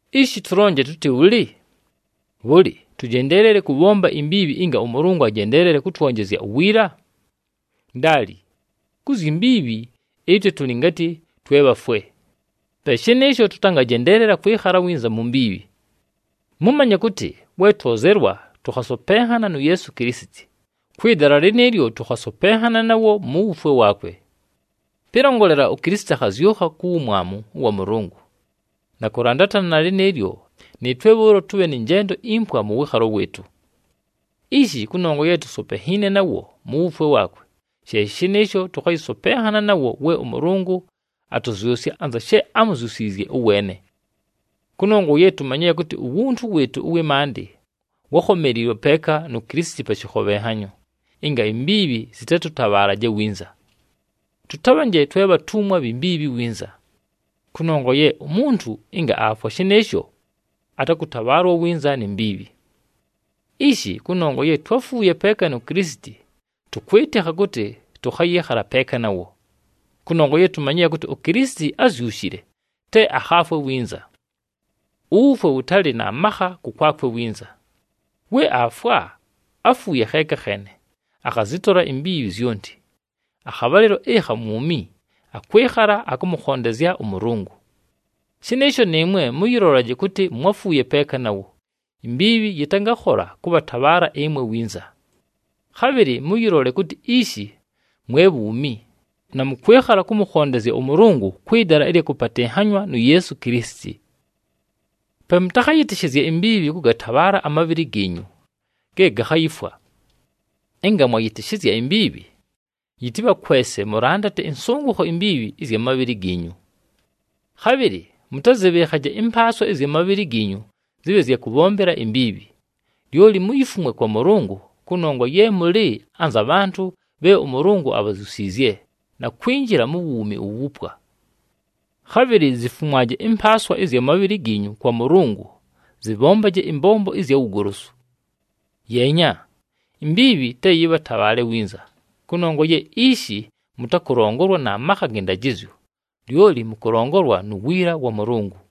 Ishi tʉlonje tʉtɨ bhʉlɨ? Bhʉlɨ, tʉjendeelele kʉbhomba imbiibhi ɨnga ʉMʉlʉngʉ ajendeelele kʉtwonjezya uwiila? Ndaali! Ku zyi mbiibhi, ɨtwe tʉlɨ ngatɨ twe bhafwe. Pe shɨnɨɨsho, tʉtangajendeelela kwɨkhala winza mu mbiibhi. Mʉmanye kʉtɨ, we twozelwa tʉkhasopenhana nu Yeesu Kilisiti, kwɨ dala lɨnɨɨlyo tʉkhasopenhana nawo mu wufwe waakwe. Pɨlongolela, uKilisiti akhazyʉkha ku wumwamu wa Mʉlʉngʉ, na kʉlandatana na lɨnɨɨlyo, nɨɨtwe bhʉʉlo tʉbhe nɨ njendo impwa mʉ wɨɨkhalo wɨɨtʉ. Ishi, kʉnongwa ye tusopenhiine nawo mu wufwe waakwe, she shɨnɨɨsho tʉkhayɨsopenhana nawo we ʉMʉlʉngʉ atʉzyʉsya anza she ámuzyusiizye ʉweene. Kʉnongwa ye tumanyile kʉtɨ uwuntu wɨɨtʉ ʉwɨ maandɨ wákhomeliilwe peeka nu Kilisiti pa shɨkhobhenhanyo, ɨnga imbiibhi zɨtatʉtabhaalaje winza. Tʉtabhanje twe bhatumwa bhi mbiibhi winza. Kʉnongwa ye umuntu ɨnga aafwa shɨnɨɨsho, atakʉtabhaalwa winza ni mbiibhi. Ishi, kʉnongwa ye twáfuuye peeka nu Kilisiti, tʉkwɨtɨkha kʉtɨ tʉkhayɨɨkhala peeka nawo. Kʉnongwa ye tumanyile kʉtɨ uKilisiti ázyushile, te akhaafwe winza. Uwufwe wʉtalɨ na makha kʉkwakwe winza. We aafwa, áfuuye kheeka kheene, akhazɨtola imbiibhi zyonti. Akhabhalɨlo ɨkha mwumi, akwɨkhala akʉmʉkhondezya ʉMʉlʉngʉ. Shɨnɨɨsho nɨɨmwe mʉyɨlolaje kʉtɨ mwáfuuye peeka nawo, imbiibhi yɨtangakhola kʉbhatabhaala ɨmwe winza. Khabhɨlɨ mʉyɨlole kʉtɨ ishi mwe bhuumi, na mʉkwɨkhala kʉmʉkhondezya ʉMʉlʉngʉ kwɨ dala ɨlya kʉpatɨnhanywa nu Yeesu Kilisiti. Pe mʉtakhayɨtɨshɨzye imbiibhi kʉgatabhaala amabhɨlɨ giinyu ge gakhayifwa. Ɨnga mwayɨtɨshɨzya imbiibhi, yɨtɨbhakwese mʉlandate ɨnsʉngʉkho imbiibhi ɨzya mabhɨlɨ giinyu. Khabhɨlɨ mʉtazɨbhɨɨkhaje ɨmpaaswa ɨzya mabhɨlɨ giinyu zɨbhe zya kʉbhombela imbiibhi. Lyoli muyifumwe kwa Mʉlʉngʉ, kʉnongwa ye mʉlɨ anza bhantʉ bhe ʉMʉlʉngʉ abhazyusiizye, na kwinjila mu wuumi uwupwa. Khabhɨlɨ zifumwaje ɨmpaaswa ɨzya mabhɨlɨ giinyu kwa Mʉlʉngʉ zɨbhombaje ɨmbombo ɨzya wugolosu. Yeenya, imbiibhi te yɨbhatabhaale winza, kʉnongwa ye ishi mʉtakʉlongolwa na makha gɨ ndajɨzyo, lyoli mʉkʉlongolwa nu wiila wa Mʉlʉngʉ.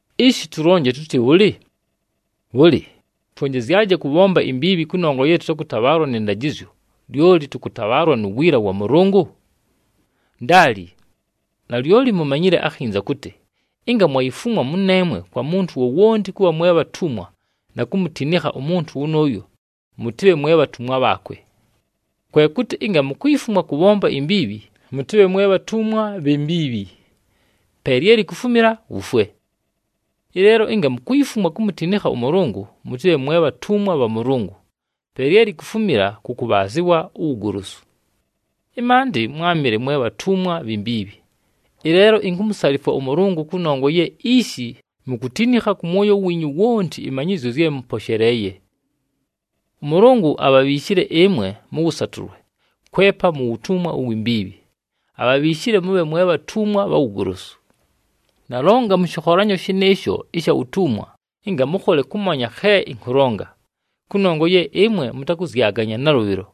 Ishi, tʉlonje tʉtɨ bhʉlɨ? Bhʉlɨ, twonjezyaje kʉbhomba imbiibhi kʉnongwa ye tʉtakʉtabhaalwa nɨ ndajɨzyo, lyoli tʉkʉtabhaalwa nu wiila wa Mʉlʉngʉ? Ndaali! Nalyoli mumanyile akhinza kʉtɨ ɨnga mwayifumwa mʉneemwe kwa muntu wowonti kʉbha mwe bhatumwa na kumutinikha umuntu wʉnʉʉyo, mʉtɨbhe mwe bhatumwa bhaakwe. Kwe kʉtɨ ɨnga mukuyifumwa kʉbhomba imbiibhi mʉtɨbhe mwe bhatumwa bhi mbiibhi, pe lye likufumila wufwe. Ɨleelo ɨnga mukuyifumwa kumutinikha ʉMʉlʉngʉ mʉtɨbhe mwe bhatumwa bha Mʉlʉngʉ, pe lye likufumila kʉ kʉbhaazɨwa uwugolosu. Ɨmaandɨ mwámɨle mwe bhatumwa bhi mbiibhi. Ɨleelo inkumusalifwa ʉMʉlʉngʉ kʉnongwa ye ishi mukutinikha kʉ mwoyo wiinyu wonti ɨmanyɨzyo zye mʉposheleeye. ɄMʉlʉngʉ abhabhiishile ɨmwe mʉ wʉsatʉlwe kwepa mu wutumwa uwi mbiibhi, abhabhiishile mʉbhe mwe bhatumwa bha wugolosu. Nalonga mʉ shɨkholanyo shɨnɨɨsho ɨsha wutumwa ɨnga mʉkhole kʉmanya khe ɨnkʉlonga, kʉnongwa ye ɨmwe mʉtakʉzyaganya nalʉbhɨlo.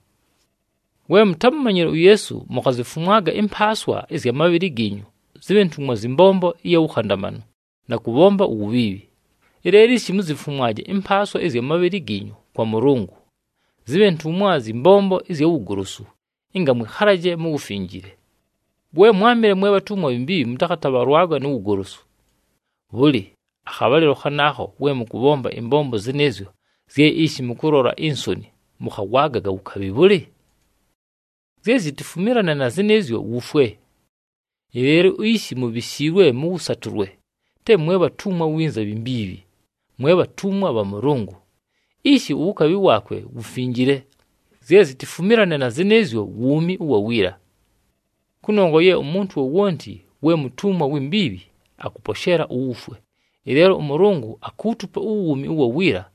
We mutámumanyile uYeesu, mukhazifumwaga ɨmpaaswa ɨzya mabhɨlɨ giinyu zɨbhe ntumwa zyɨ mbombo ɨya wukhandamanu na kʉbhomba uwubhiibhi. Ɨleelo ishi, muzifumwaje ɨmpaaswa ɨzya mabhɨlɨ giinyu kwa Mʉlʉngʉ, zɨbhe ntumwa zyɨ mbombo ɨzya wugolosu ɨnga mwɨkhalaje mu wufinjile. We mwámɨle mwe bhatumwa bhi mbiibhi, mʉtakhatabhalwaga nu wugolosu. Bhʉlɨ, akhabhalɨlo khanaakho we mʉkʉbhomba ɨmbombo zɨnɨɨzyo zye ishi mʉkʉlola insoni, mʉkhawagaga wukabhi bhʉlɨ? Zye zitifumilane na zɨnɨɨzyo wufwe! Ɨleelo ishi, mubhishiilwe mʉ wʉsatʉlwe, te mwe bhatumwa winza bhi mbiibhi, mwe bhatumwa bha Mʉlʉngʉ. Ishi uwukabhi waakwe wufinjile. Zye zitifumilane na zɨnɨɨzyo wuumi ʉwa wiila! Kʉnongwa ye umuntu wowonti we mutumwa wi mbiibhi, akʉposheela uwufwe. Ɨleelo ʉMʉlʉngʉ akuutupa uwuumi ʉwa wiila,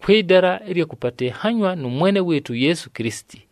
kwɨ dala ɨlya kʉpatɨnhanywa nʉ Mwene wɨɨtʉ uYeesu Kilisiti.